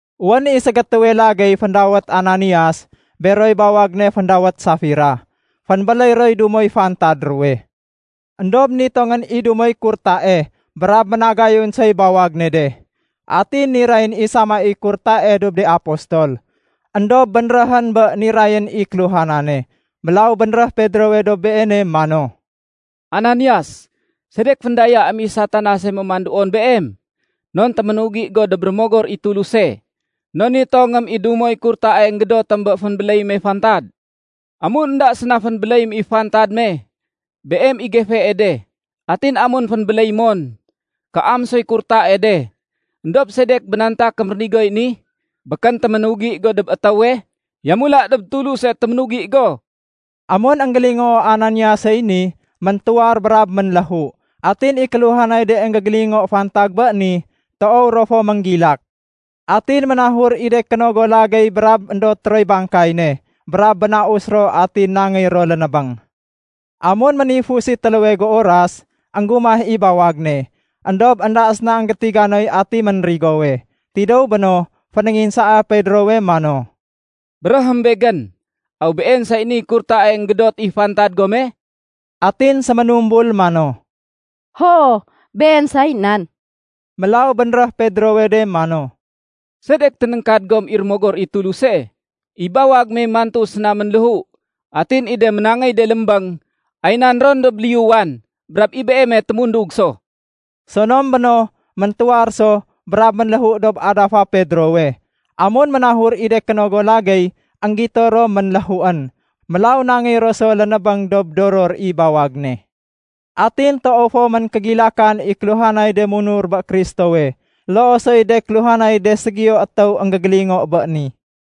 Wén i ségétéwe lagéy féndawét Ananias, beroy bawag ne féndawét Safira, fénbéléy roy dumoy fantad ruwe. Endob nitongén i dumoy kurtae brab ménagayun soy bawag ne de. Atin nirayén i sama i kurtae dob de apostol. Endob bénréhén bé nirayén i kéluhanane. Mélaw bénréh Pedrowe dob beene mano, “Ananias, sedek féndayaém i Satanase mémanduon beem? Non téménugi go dob Rémogor i Tuluse, non nitongém i dumoy kurtae énggédotém bé fénbéléy me fantad. Amun énda séna fénbéléyém i fantad me, beem i gefee de. Atin amun fénbéléy mon, kaam soy kurtae de. Endob sedek bénantakém rénigoy ni? Békén téménugi go dob étéwe, yamula dob Tuluse téménugi go!” Amun énggélingoo Ananiasey ni, méntuwar brab ménléhu. Atin i kéluhanay de énggégélingo fantag bé ni, toow ro fo ménggilak. Atin ménahur i de kénogo lagéy brab éndot roy bangkay ne brab bénaus ro atin nangéy ro lénébéng. Amun ménifus i téléwe géuras, énggumah i bawag ne, éndob énda séna énggétiga noy ati ménrigowe. Tidéw béno, fénénginsaa Pedrowe mano, “Béréhém begén, aw been say niy kurtae énggédot i fantad gome?” Atin séménumbul mano, “Hoo, been say nan.” Mélaw bénréh Pedrowe de mano, “Sedek ténéngkad gom i Rémogor i Tuluse? I bawag me mantu séna ménléhu atin i de ménangéy de lémbéng, ay nan ron dob liyuwan, brab i beeme témundug so.” Sonom béno, méntuwar so brab ménléhu dob adafa Pedrowe. Amun ménahur i de kénogo lagéy, énggito ro ménléhuén. Mélaw nangéy ro so lénébéng dob doror i bawag ne. Atin toow fo méngkégilakan i kéluhanay de munur bé Kristowe, loo soy de kéluhanay de ségiyo étéw énggégélingo bé ni.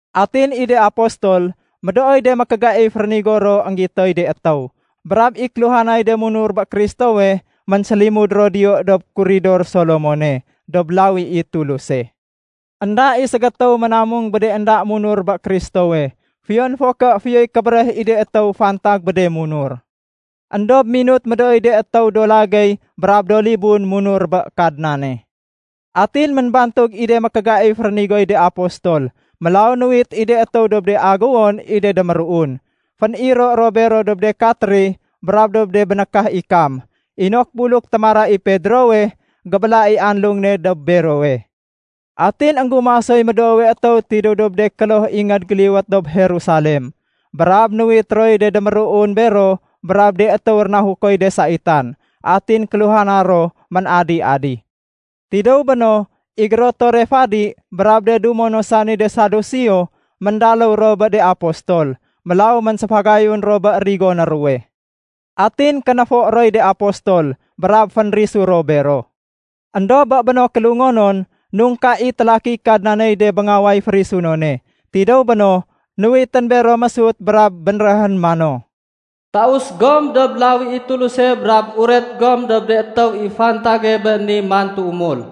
Atin i de apostol, médooy de mékégaif rénigo ro énggitoy de étéw. Brab i kéluhanay de munur bé Kristowe ménsélimud ro diyo dob “Kuridor Solomone” dob lawi i Tuluse. Enda i ségétéw ménamung bé de énda munur bé Kristowe, fiyon fo ké fiyoy kébéréh i de étéw fantag bé de munur. Endob minut médooy de étéw do lagéy brab do libun munur bé Kadnane. Atin ménbantug i de mékégaif rénigoy de apostol. Mélaw nuwit i de étéw dob de aguwon i de déméruun. Féniro ro bero dob de katri brab dob de bénékah ikam inok buluk témara i Pedrowe, gébéla i anlung ne dob berowe. Atin énggumah soy médoowe étéw tidéw dob de kloh ingéd géliwét dob Jerusalem. Brab nuwit roy de déméruun bero brab de étéw rénahukoy de saitan. Atin kéluhana ro ménadi-adi. Tidéw béno, i gérotore fadi brab de dumo no sani de Saduseo, méndaléw ro bé de apostol. Mélaw ménséfagayun ro bé rigoné ruwe. Atin kénéfo roy de apostol brab fénrisu ro bero. Endob bé béno kélungonon, nungka i télakiy Kadnaney de béngaway férisunone. Tidéw béno nuwitén bero mésut brab bénréhén mano, “Taus gom dob lawi i Tuluse brab uret gom dob de étéw i fantage bé ni mantu umul.”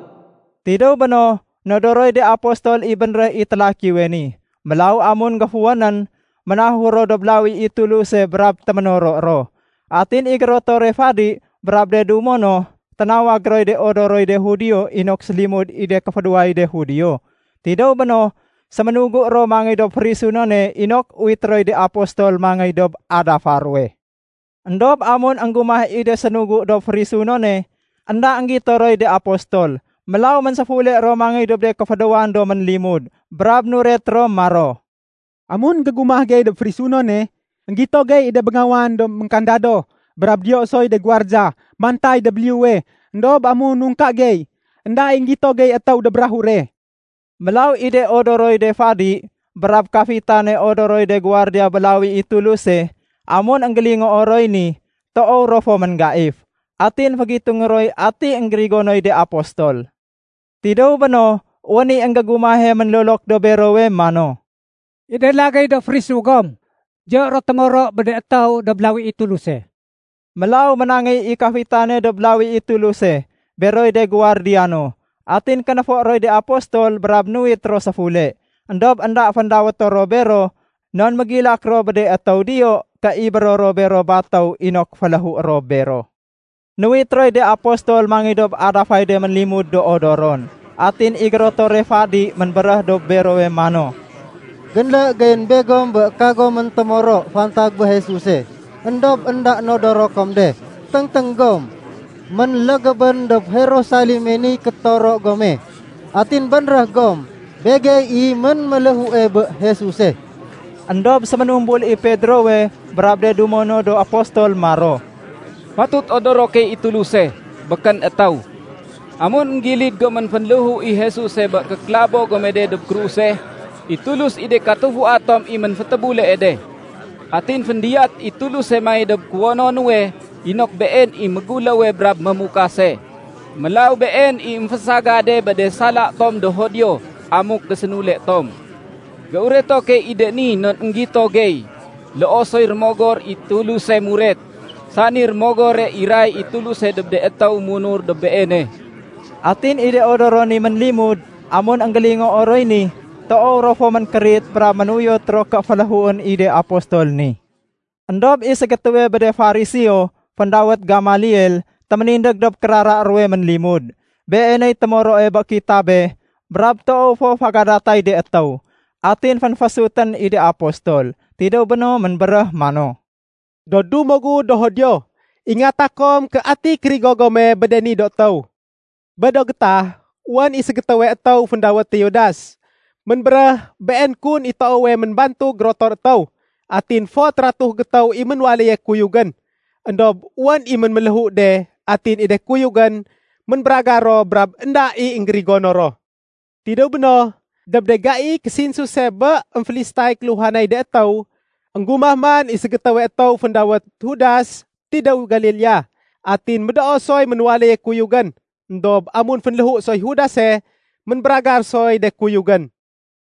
Tidéw béno, nodoroy de apostol i bénréh i télakiwe ni. Mélaw amun géfuwénén, ménahur ro dob lawi i Tuluse brab téménoro ro. Atin i gérotore fadi brab de dumo no, ténawag roy de odoroy de Judio inok sélimud i de kéfédéway de Judio. Tidéw béno, séménugu ro mangéy dob férisunone inok uwité roy de apostol mangéy dob adafa ruwe. Endob amun énggumah i de sénugu dob férisunone, énda énggito roy de apostol. Mélaw ménséfule ro mangéy dob de kéfédéwan do ménlimud brab nuret ro maro, “Amun énggégumah gey dob férisunone, énggito gey i de béngawan do ménkandado brab diyo soy de guwardiya mantay dob liyuwe. Endob amun nungka gey, énda i énggito gey étéw dob rahure.” Mélaw i de odoroy de fadi brab kafitane odoroy de guwardiya bé lawi i Tuluse, amun énggélingoo roy ni, toow ro fo ménggaif. Atin fégitungé roy ati énggérigonoy de apostol. Tidéw béno, wén i énggégumahe ménlolok dob berowe mano, “I de lagéy do fénrisu gom, diyo ro témoro bé de étéw dob lawi i Tuluse.” Mélaw ménangéy i kafitane dob lawi i Tuluse beroy de guwardiya no. Atin kénéfo roy de apostol brab nuwit ro séfule. Endob énda féndawéto ro bero non mégilak ro bé de étéw diyo ké ibéro ro bero batéw inok féléhué ro bero. Nuwit roy de apostol mangéy dob adafay de ménlimud do odoron. Atin i gérotore fadi ménbéréh dob bero mano, “Génlé geyén begom bé kagomén témoro fantag bé Jesuse, éndob énda nodoro kom de. Téngténg gom, ménlégébén dob Jerusaleme niy kétoro gome, atin bénréh gom, begey i ménméléhue bé Jesuse.” Endob séménumbul i Pedrowe brab de dumo no do apostol maro, “Fatut odoro key i Tuluse, békén étéw. Amun énggilid gomén fénléhu i Jesuse bé kékélabo gome de dob kruse, i Tulus i de katufua tom i ménfétébulee de. Atin féndiyat i Tuluse mangéy dob kuwono nuwe inok Been i Méguléwe brab Mémukase. Mélaw Been i émfésagade bé de sala tom do Judio amuk gésénule tom. Géureto key i de ni non énggito gey, loo soy Rémogor i Tuluse muret, sani Rémogore iray i Tuluse dob de étéw munur dob Beene.” Atin i de odoron ni ménlimud, amun énggélingoo roy ni, toow ro fo ménkérit brab ménuyot ro ké féléhuén i de apostol ni. Endob i ségétéwe bé de Fariseo féndawét Gamaliel téménindég dob kérara ruwe ménlimud. Beeney témoroe bé kitabe brab toow fo fégadatay de étéw. Atin fénfésutén i de apostol. Tidéw béno ménbéréh mano, “Do dumo gu do Judio, ingata kom ké ati kérigo gome bé de ni do étéw. Bé do gétah wén i ségétéwe étéw féndawét Teudas, ménbéréh been kun i toowe ménbantug gérotor étéw. Atin fot ratuh gétéw i ménwaléye kuyugén. Endob wén i ménméléhu de atin i de kuyugén ménbéragar ro brab énda i énggérigono ro. Tidéw béno, dob de gaiy késinsuse bé émfélistay kéluhanay de étéw, énggumah man i ségétéwe étéw féndawét Judas tidéw Galilea. Atin médoo soy ménwaléye kuyugén. Endob amun fénléhu soy Judase, ménbéragar soy de kuyugén.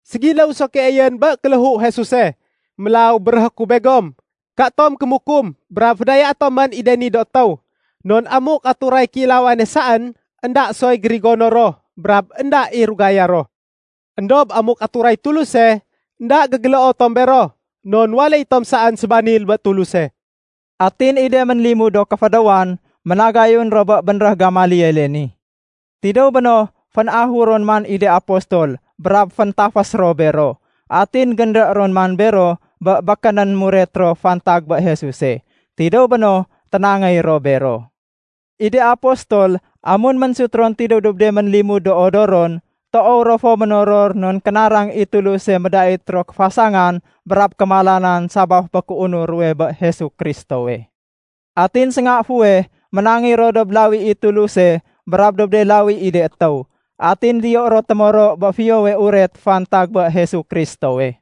Ségiléw so keeyén bé kéléhu Jesuse. Mélaw béréhé ku begom, katom kémukum brab fédayaé tomén i de ni do étéw. Non amuk aturay kéilawane saén, énda soy gérigono ro brab énda i rugaya ro. Endob amuk aturay Tuluse, énda gégéléo tom bero, non waléy tom saén sébanil bé Tuluse.” Atin i de ménlimud do kéfédéwan, ménagayun ro bé bénréh Gamaliele ni. Tidéw béno, fénahur ron man i de apostol brab féntafés ro bero. Atin génlé ron man bero bé békénén muret ro fantag bé Jesuse. Tidéw béno, ténangéy ro bero. I de apostol amun ménsut ron tidéw dob de ménlimud do odoron, toow ro fo ménoror non kénarang i Tuluse médait ro kéfasangan brab kémalanan sabaf bé kéunur ruwe bé Jesu Kristowe. Atin sénga fuweh ménangéy ro dob lawi i Tuluse brab dob de lawi i de étéw. Atin diyo ro témoro bé Fiyowe Uret fantag bé Jesu Kristowe.